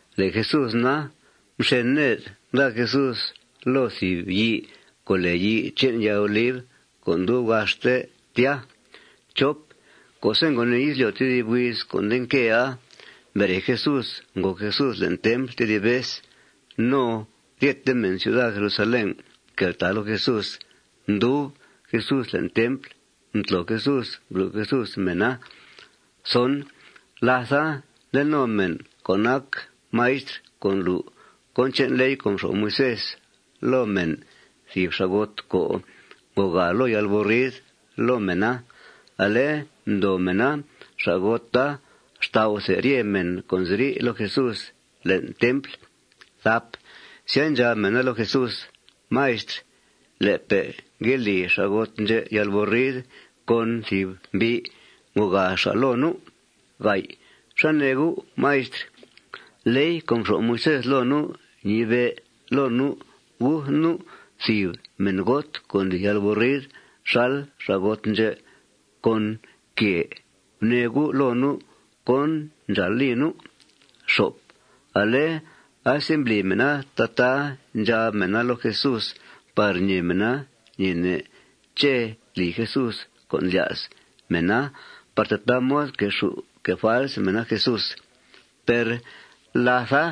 Le' Jesús na, mxen ned, nda Jesús loo thìb yii co' lèe yii che'n yaa oliv co' ndub gaxte tya. Co'se' ngo nìi izlyo' tedib huiz co' nde nquea, mbere Jesús, ngòo Jesús le'n templ tedib vez. No ryete mèn ciuda Jerusalén mqueltàa loo Jesús. Mdub Jesús le'n templ. Mtlo Jesús, mblu' Jesús mèna. Látha, nde no mèn co' nac maistr co' ndlu' cón che'n ley co' mxo'f Moisés loo mèn thìb xa'got co' ngogaa loo yalburrid loo mèna. Ale mdoo mèna xa'gota xtau'the rye mèn co' nziri' loo Jesús le'n templ. Sya, ndxab mèna loo Jesús: ―Maistr, le'pe' ngue li xa'got ndxè' yalburrid con thìb mbi' ngogaa xa' loo nu'. ¿Xá nee U', Maistr? Ley co' mxo'f Moisés loo nu' ñibe' loo nu' guth nu' thìb mèngot, co' ndli yalburrid xal xa'got ndxè', con quèe. Gunee U' loo nu' cón ndxàal li nu'. Ale asembli mèna tataa ndxab mèna loo Jesús par ñee mèna ñeene' ché' tli Jesús con' ndlya's mèna par tataa mod quexù' que' fals mèna Jesús. Per látha,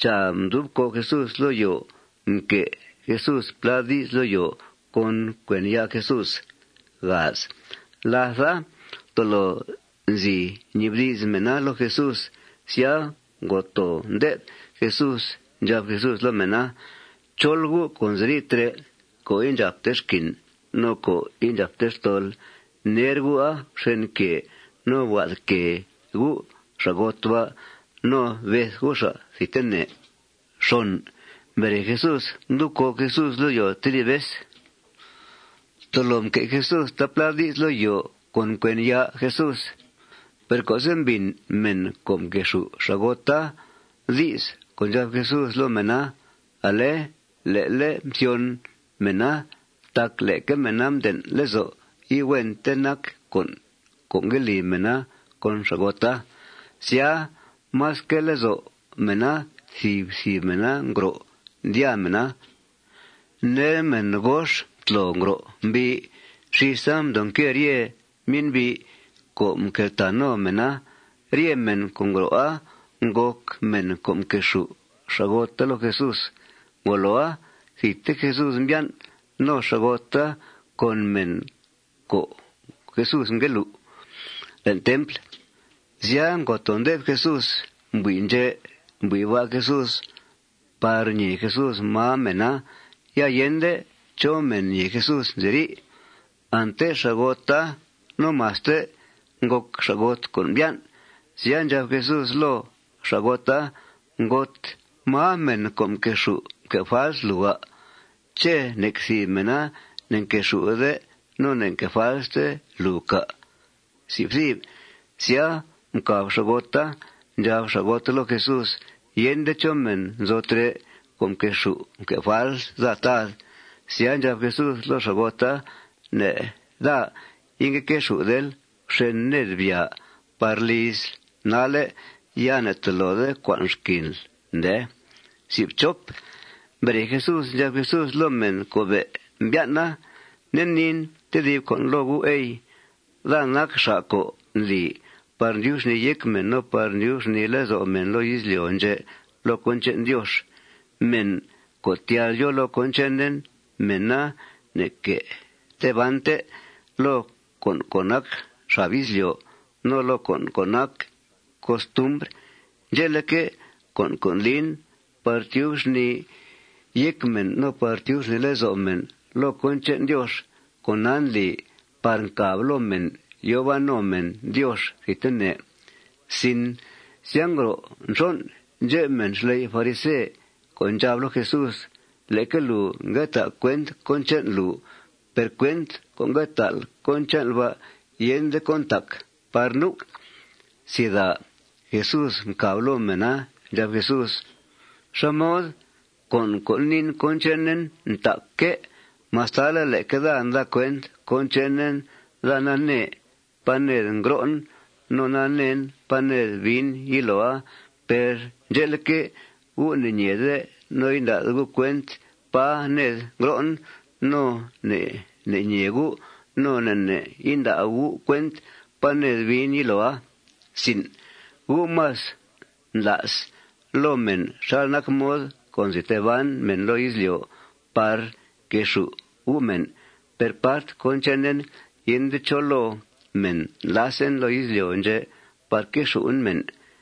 chàa, mdub còo' Jesús loo yòo. Mque' Jesús plá di's loo yòo con cuen ya' Jesús. Látha, tolo nzi ñibdi's mèna loo Jesús. Sya, ngo too ndé'f Jesús. Ndxab Jesús loo mèna: ―Chol gu' co' nziri' trè' co' indxàpte xquin no co' indxàpte xtol, ner gu'a fxen quèe no bga'th quèe gu' xa'got ba' no beth gu' xa' thidtene. Mbere Jesús, mdub còo' Jesús loo yòo tedib vez. Tolo mque' Jesús taaplá di's loo yòo con cuen ya' Jesús. Per co'se' mbìn mèn co' mquexù' xa'gota di's co' ndxab Jesús loo mèna, ale le'le' mthyon mèna tac leque mèna mden' lezo' ihuente nac con' co' ngue li mèna con xa'gota. Sya, más quee lezo' mèna thìb thìb mèna ngro', ndyàa mèna. Ner, mèn gox mtlo ngro' mbii. Xísa mdoo nque rye myen'bi' co' mqueltàa no mèna. Rye mèn co' ngro'a ngòc mèn co' mquexù' xa'gota loo Jesús. Ngoloa, thidte Jesús mbyan' no xa'gota con mèn co' ngue lu' Jesús le'n templ. Sya, ngo too ndé'f Jesús. Mbui' ndxè', mbui' ba' Jesús par ñèe Jesús máa mèna. Ya yende chó mèn ñèe Jesús nziri'. Ante xa'gota no maste ngòc xa'got co' mbyan'. Sya, ndxab Jesús loo xa'gota: ―Ngot, ¿máa mèn co' mquexù' mque' fals lùu, à'? ¿Ché' nec thìb mèna ne'nquexù'de no ne'nque' falste lùu, cà'? Sya, mcàb xa'gota. Ndxab xa'gota loo Jesús: ―Yende chó mèn nzo trè' co' mquexù' mque' fals daa, Tad. Sya, ndxab Jesús loo xa'gota: ―Ne' daa ingue quexù'del. Fxen ned. Byàa par lizl nalle'. Ya ne'tolode cua'nl xquinl, ndee. Mbere Jesús, ndxab Jesús loo mèn co' be' mbyan'a: ―Nde niin tedib con' loo gu', ey: Daa nac xa' co' ndli par ndyub xnìi yéc mèn no par ndyub xnìi lezo' mèn loo izlyo' ndxè' loo cón che'n Diox. Mèn co' tyal yòo loo cón chenen, mèna ne'que tee bante loo con' co' nac xab izlyo' no loo con' co' nac costumbr. Ndxe'leque', con' co' ndlin par tyub xnìi yéc mèn no par tyub xnìi lezo' mèn loo cón che'n Diox, con'a ndli par ncàb loo mèn yòo ban no mèn Diox thidtene. Sya, ngro' nxon' ndxep mèn xley' farise co' ndxab loo Jesús: ―Leque lùu ngue ta' cuent cón che'n lùu. Per cuent co' nda'l cón che'nl ba' yende cón ntac par nu'. Jesús mcàb loo mèna. Ndxab Jesús: ―¿Xá mod? Con' co' niin cón chenen ntacque'. Mastale' leque daa nda cuent cón chenen, daa nanee pá ned ngro'en no naneen pá ned biin yiloa. Per ndxe'leque', gu' ne'ñeede no inda'de gu' cuent pá ned ngro'en. No ne' ne' ñee gu' no ne' ne' inda' gu' cuent pá ned biin yiloa. Gu' más ndla's loo mèn xal nac mod co' nzi tee ban mèn loo izlyo' par quexù' gu' mèn. Per part cón chenen, yende chó loo mèn ndlasen loo izlyo' ndxè' par quexù'en mèn.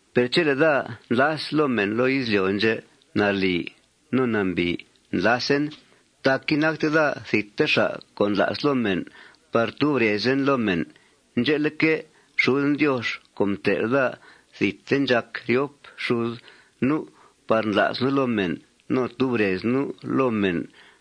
Per chele' daa ndlas loo mèn loo izlyo' ndxè', nalì no nambìi ndlasen. Tac inacte daa thidte xa' co' ndla's loo mèn par tub rezen loo mèn. Ndxe'leque', xuden Diox co' mtel' daa, thidte ndxàc ryop xud nu' par ndla's nu' loo mèn no tub rez nu' loo mèn.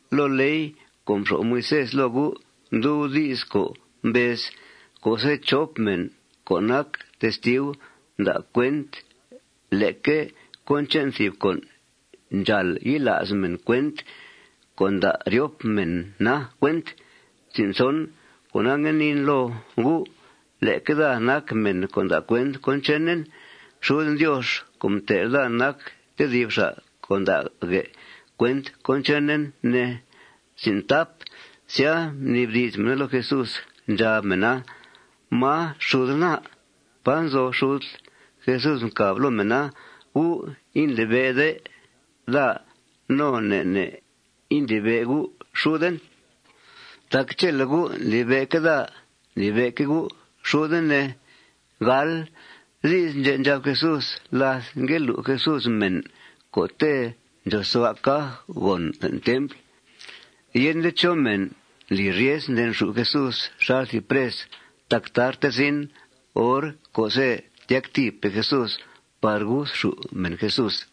Loo ley co' mxo'f Moisés loo gu' ndub di's co' mbez: Co'se' chop mèn co' nac testiu nda' cuent leque cón che'n thìb con', ndxàal yila's mèn cuent co' nda' ryop mèna cuent. Cona, ngue niin loo gu': Leque daa nac mèn co' nda' cuent cón chenen. Xuden Diox co' mtel' daa nac tedib xa' co' nda'guè' cuent cón chenen, ne. Sya, mnibdi's mèna loo Jesús. Ndxab mèna: ―¿Máa xudl, na? ¿Pá nzo xudl? Jesús mcàb loo mèna: ―Gu' indlibe'de daa no ne' ne' ndlibe' gu' xuden. Tac chele' gu' ndlibe'que' daa, ndlibe'que' gu' xuden, ne. Di's ndxè' ndxab Jesús láth ngue lu' Jesús mèn co'te' ndxòosua' caj gòn le'n templ. Yende chó mèn ngli ryes ndenxù' Jesús xal thìb pres tac tarte zin hor co'se' tyactìipe' Jesús par guthxù' mèn Jesús.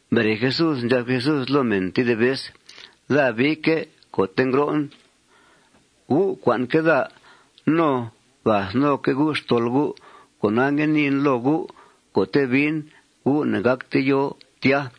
Mbere Jesús, ndxab Jesús loo mèn tedib vez: ―Daa biique' co'te' ngro'en. Gu' cua'nque' daa no gath noque' gu' xtol gu'. Cona, ngue niin loo gu': Co'te' biin, gu' ne'gácte yòo tya.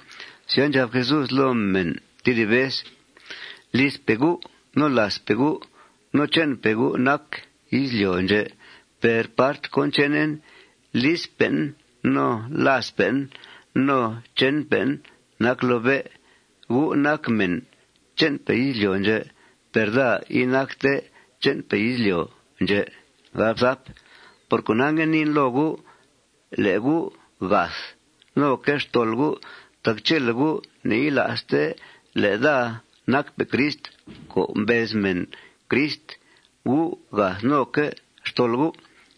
Sya, ndxab Jesús loo mèn tedib vez: ―Lizpe' gu' no làazpe' gu' no che'npe' gu' nac izlyo' ndxè'. Per part cón chenen, lizpe'en no làazpe'en no che'npe'en nac loo bé'. Gu' nac mèn che'npe' izlyo' ndxè'. Per daa inacte che'npe' izlyo' ndxè'. Por cona, ngue niin loo gu': Le' gu' gath noque' xtol gu' tac chele' gu' ne'yila'ste le' daa nacpe' Crist co' mbez mèn Crist, gu' gath noque' xtol gu'.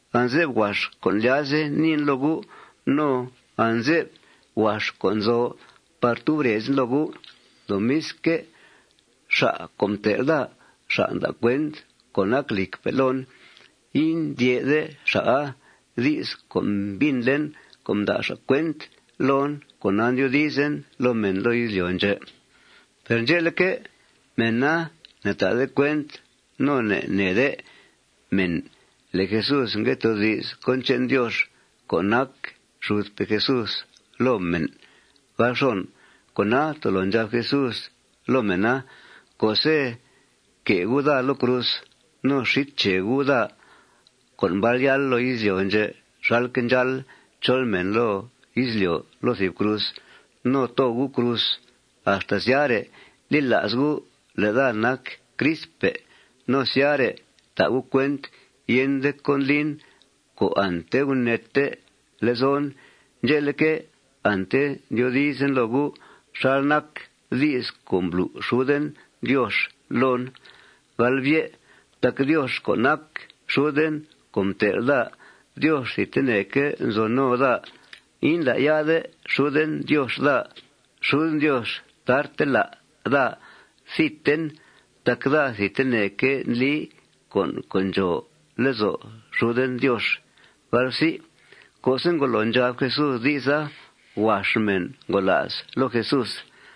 Anze'f huax con' ndlyazen niin loo gu'. No anze'f huax con' nzo par tub rezen loo gu'. Lomisque', xa' co' mtel' daa, xa' nda' cuent co' nac lìcpe' loon. Indyè'de xa'a. Di's co' mbìnlen co' nda' xa' cuent loon, cona ndyoodizen loo mèn loo izlyo' ndxè'. Per ndxe'leque', mèna ne'ta'de cuent no ne'neede mèn le' Jesús ngue toodi's cón che'n Diox co' nac xudpe' Jesús loo mèn. Cona, tolo ndxab Jesús loo mèna: ―Co'se' que' gu' daa loo cruz no xít che gu' daa, daa co' mbal yáal loo izlyo' ndxè' xalque' ndxáal chol mèn loo izlyo', loo thìb cruz no too gu' cruz, axta syare' li la's gu' le' daa nac Cristpe'. No syare' ta' gu' cuent yende cón ndlin co' ante guneete lezon. Ndxe'leque', ante ndyoodizen loo gu' xal nac di's co' mblu' xuden Diox loon. Tac Diox co' nac xuden co' mtel' daa, Diox thidteneque' nzo no daa. Indlá'ya'de xuden Diox daa. Xuden Diox tarte lá' daa thidten tac daa thidteneque' ndli con' co' ndxòo lezo' xuden Diox. Co'se' ngolo ndxab Jesús di'sa, huax mèn ngola's loo Jesús.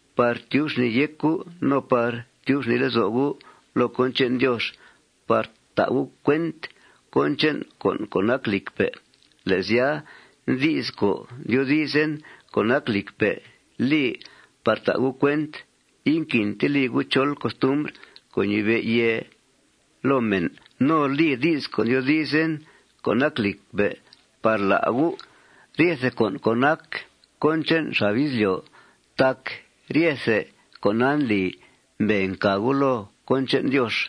par tyub xnìi yéc gu' no par tyub xnìi lezo' gu' loo cón che'n Diox par ta' gu' cuent cón che'n con' co' nac lìcpe'. Le' sya, di's co' ndyoodizen co' nac lìcpe' li par ta' gu' cuent inquinte li gu' chol costumbr co' ñibe' yèe loo mèn, no li di's co' ndyoodizen co' nac lìcpe' par lá' gu' ryethe con' co' nac cón che'n xab izlyo'. Tac ryethe con'a ndli mbee ncà gu' loo cón che'n Diox.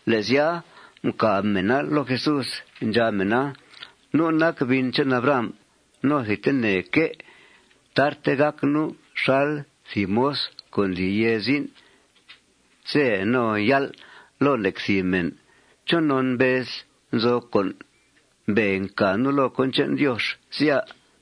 Le' sya, mcàb mèna loo Jesús. Ndxab mèna: ―Nu' nac bin che'n Abraham. No, thidteneque' tarte gàc nu' xal thìb moz co' ndli yèe zin' ze no yál' loo nec thìb mèn. ¿Chonon mbezl: Nzo con' mbee ncà nu' loo cón che'n Diox, sya?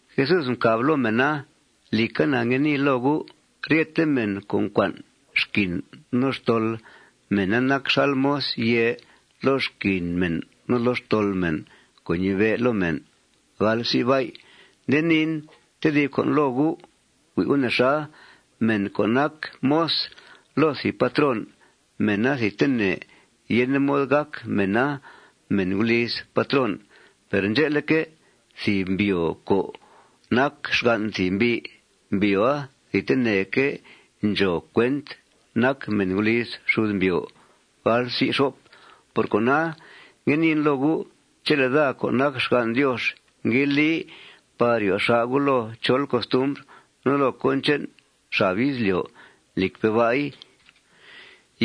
Jesús mcàb loo mèna: ―Lìca, na ngue nii loo gu': Ryete mèn co' ncua'n xquin no xtol, mèna nac xal moz yèe loo xquin mèn no loo xtol mèn co' ñibe' loo mèn. Nde niin tedib con' loo gu': Hui' gu' nexa. Mèn co' nac moz loo thìb patrón, mèna thidtene yende mod gàc mèna mèn guliz patrón. Per ndxe'leque', thìb mbyòo co' nac xgan' thìb mbi', mbyòoa thidteneque' ndxòo cuent nac mèn guliz xud mbyòo. Por cona, ngue niin loo gu': Chele' daa co' nac xgan' Diox ngue li par ryo xà' gu' loo chol costumbr no loo cón che'n xab izlyo', lìcpe' ba'i,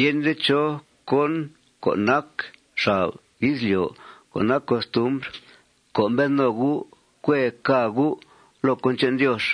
yende chó cón co' nac xab izlyo' co' nac costumbr co' mbed no gu' cuee cà gu' loo cón che'n Diox.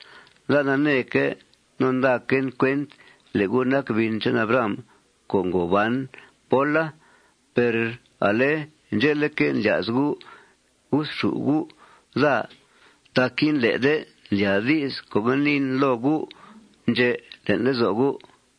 Daa naneeque' no ndaquen cuent le' gu' nac bin che'n Abraham co' ngo ban póla. Per ale ndxe'leque', ndlya's gu' guthxù' gu' daa tac indlé'de ndlyàa di's co' ngue niin loo gu' ndxè' le'n lezo' gu'.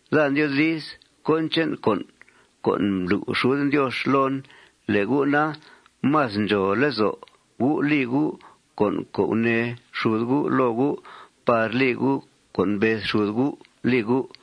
Daa ndyoodiz cón che'n con' co' mblu' xuden Diox loon. Le' gu' na, más ndxòo lezo' gu' li gu' con' co' gunee xud gu' loo gu' par li gu' cón mbez xud gu' li gu'.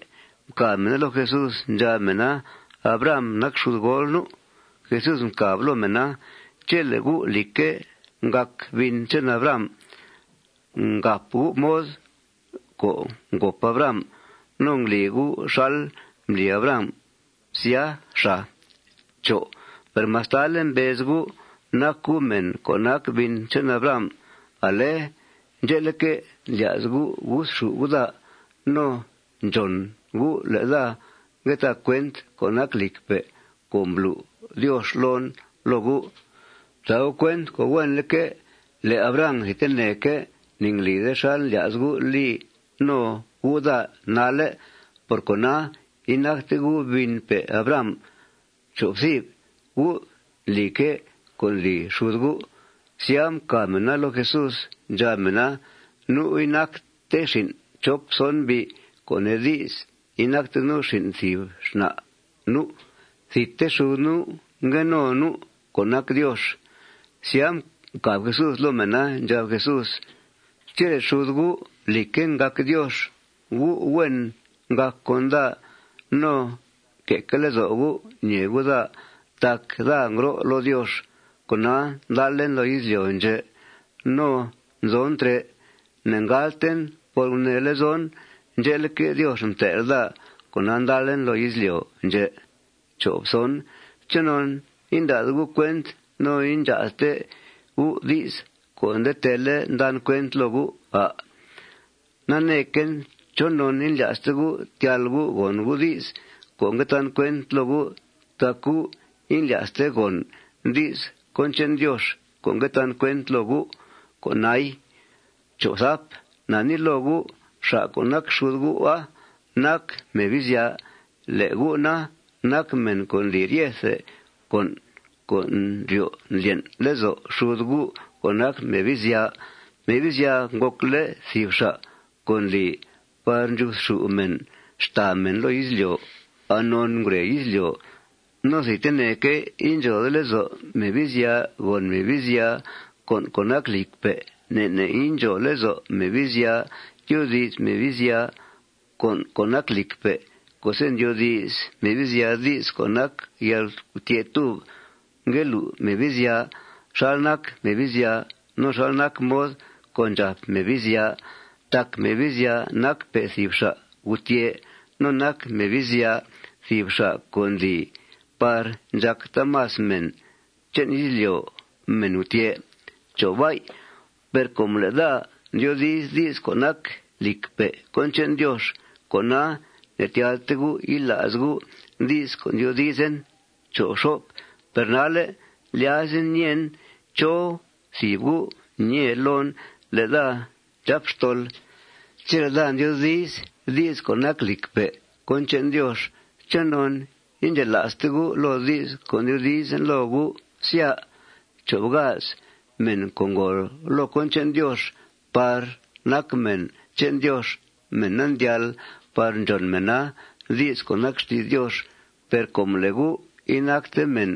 Mcàb mèna loo Jesús. Ndxab mèna: ―Abraham nac xudgool nu'. Jesús ndxab loo mèna: ―Chele' gu', lìcque', ngàc bin che'n Abraham, ngàp gu' mod co' ngòp Abraham, no ngli gu' xal mbli Abraham, sya, xàa. Per mastale' mbez gu' nac gu' mèn co' nac bin che'n Abraham, ale ndxe'leque', ndlya's gu' guthxù' gu' daa. No, ndxòn gu' le' daa ngue ta' cuent co' nac lìcpe' co' mblu' Diox loon loo gu'. Fta' gu' cuent co' huenleque' le' Abraham thidteneque' ne'nglide xal ndlya's gu' li no gu' daa nalle'. Por cona, inacte gu' binpe' Abraham. Gu' ndlique' cón ndli xud gu'. Sya, mcàb mèna loo Jesús. Ndxab mèna: ―Nu' inacte xin' chop son mbi', co' nee di's, inacte nu' xin' thìb xna' nu'. Thidte xud nu' ngue no nu', co' nac Diox. Sya, mcàb Jesús loo mèna. Ndxab Jesús: ―Chele' xud gu', lìcque', ngàc Diox, gu' huen ngàc con daa no que'que' lezo' gu' ñèe gu' daa tac daa ngro' loo Diox. Cona, ndalen loo izlyo' ndxè' no nzon trè'. Ne'ngàlten por gunee lezon. Ndxe'leque', Diox mtel' daa. Cona, ndalen loo izlyo' ndxè'. ¿Chonon inda'de gu' cuent no indxaa'dte gu' di's co' nde teele' ndan cuent loo gu', à'? Neequen chonon indlya'ste gu' tyal gu' gòn gu' di's co' ngue tan cuent loo gu'. Tac gu' indlya'ste gòn di's cón che'n Diox co' ngue tan cuent loo gu'. Con'ai. Na nii loo gu': Xa' co' nac xud gu'a nac Mebizya. Le' gu' na, nac mèn co' ndli ryethe con' co' ndryo' ndlyen' lezo' xud gu' co' nac Mebizya. Mebizya ngòcle' thìb xa' co' ndli par ndxuthxù' mèn xtàa mèn loo izlyo' anon ngure izlyo'. No thidteneque' indxòode lezo' Mebizya gòn Mebizya con' co' nac lìcpe'. Ne' ne' indxòo lezo' Mebizya tyoodi's Mebizya con' co' nac lìcpe'. Co'se' ndyoodi's Mebizya di's co' nac yalgutyè'túb, ngue lu' Mebizya xal nac Mebizya no xal nac mod co' ndxàp Mebizya. Tac Mebizya nacpe' thìb xa' gutyè'. No nac Mebizya thìb xa' co' ndli par ndxàc taamas mèn che'n izlyo' mèn gutyè'. Per com le' daa ndyoodi's di's co' nac lìcpe' cón che'n Diox, cona, ne'tyalte gu' yila's gu' di's co' ndyoodizen. Per nalle' ndlyazen ñeen chó thìb gu' ñee loon le' daa ndxàp xtol. Chele' daa ndyoodi's di's co' nac lìcpe' cón che'n Diox, ¿chonon indxela'ste gu' loo di's co' ndyoodizen loo gu', sya? Mèn co' ngòo loo cón che'n Diox par nac mèna che'n Diox, mèna ndyal par ndxòn mèna di's co' nac xti's Diox. Per com le' gu' inacte mèn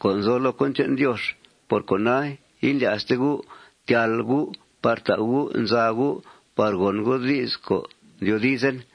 co' nzo loo cón che'n Diox, por cona, indlya'ste gu' tyal gu' par ta' gu' nza gu' par gòn gu' di's co' ndyoodizen.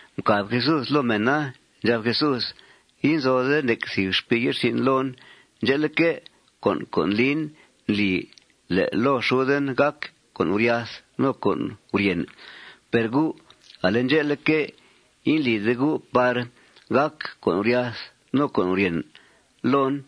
Mcàb Jesús loo mèna. Ndxab Jesús: ―Inzode nec thìb xpii ye'rsin' loon. Ndxe'leque', con' co' ndlin ndli le' loo xuden gàc con' guryath no con' guryèn. Per gu', ale ndxe'leque', indlide par gàc con' guryath no con' guryèn loon.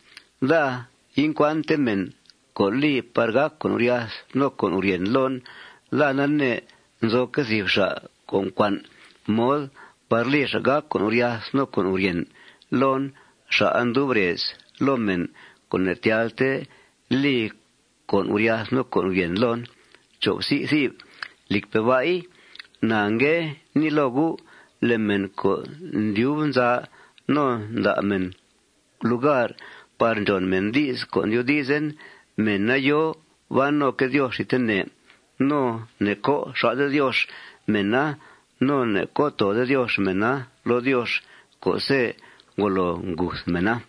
Daa incua'nte mèn co' li par gàc con' guryath no con' guryèn loon. Daa nanee nzoque' thìb xa' co' ncua'n mod par li xa' gàc con' guryath no con' guryèn loon. Xa'a ndub rez loo mèn co' ne'tyalte li con' guryath no con' guryèn loon. Lìcpe' ba'i, na ngue nii loo gu': Le' mèn co' ndyub nza no nda' mèn lugar par ndxòn mèn di's co' ndyoodizen, mèna yòo ban noque' Diox thidtene. No ne'co' xà'de Diox mèna. No ne'co' toode Diox mèna loo Diox co'se' ngolo nguth mèna.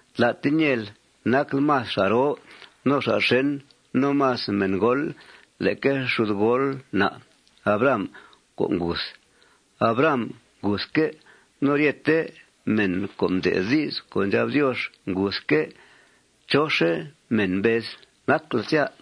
Tlate ñeel nacl más xa' roo xa' xèn no más mèngool leque xudgool na' Abraham co' nguth. Abraham nguthque'. No ryete mèn co' mde'th di's co' ndxab Diox nguthque'. ¿Chóxe' mèn mbezl nacl, sya?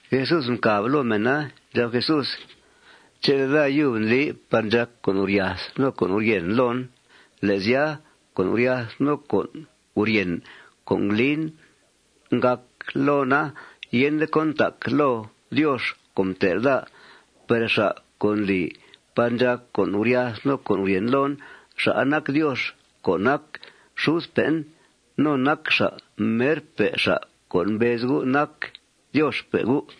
Jesús mcàb loo mèna. Ndxab Jesús: ―Chele' daa yub ndli par ndxàc con' guryath no con' guryèn loon, le' sya, con' guryath no con' guryèn co' nglin ngàc loona yende cón ntaca loo Diox co' mtel' daa. Per xa' co' ndli par ndxàc con' guryath no con' guryèn loon, xa'a nac Diox co' nac xudpe'en. No nac xa' merpe' xa' co' mbez gu' nac Dioxpe' gu'.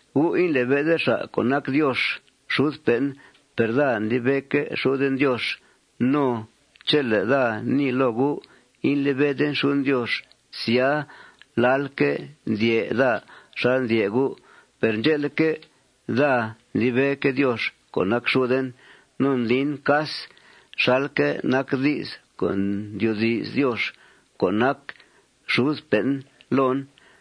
Gu' indlibe'de xa' co' nac Diox xudpe'en. Per daa ndlibe'que' xuden Diox. No chele' daa nii loo gu' indlibeden xuden Diox, sya, lalque' ndyè' daa xal ndyè' gu'. Per ndxe'leque', daa ndlibeque' Diox co' nac xuden. No ndlin cas xalque' nac di's co' ndyoodi's Diox co' nac xudpe'en loon.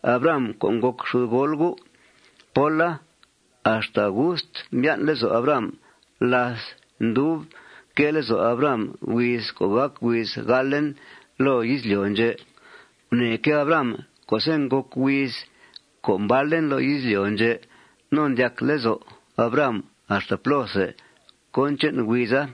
Abraham co' ngòc xudgool gu' póla, axta gust mbyan' lezo' Abraham láth ndub quee lezo' Abraham huiz co' gàc huiz galen loo izlyo' ndxè'. Gunèeque' Abraham co'se' ngòc huiz co' mbalen loo izlyo' ndxè'. No mdyac lezo' Abraham axta plóthe cón che'n huiza.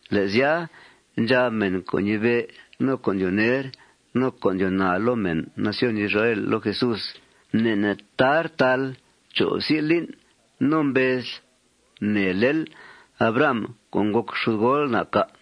Le' sya, ndxab mèn co' ñibe', no co' ndyoo ner, no co' ndyoo naa loo mèn nación Israel loo Jesús: ―Ne' ne' tar taal cho' psi' lin' no ¿mbezl gunèelel Abraham co' ngòc xudgool na', cà'?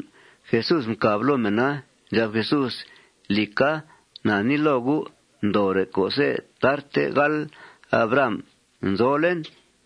Jesús mcàb loo mèna. Ndxab Jesús: ―Lìca, na nii loo gu': Ndoore' co'se' tarte gáal Abraham, nzolen.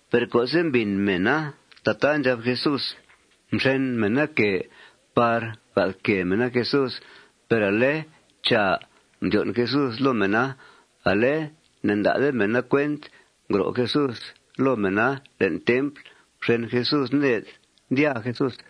Per co'se' mbìn mèna tataa ndxab Jesús, mxen mèna quèe par gathquèe mèna Jesús. Per ale, chàa, mdyon' Jesús loo mèna. Ale ne'nda'de mèna cuent ngro' Jesús loo mèna le'n templ. Mxen Jesús ned, ndyaa Jesús.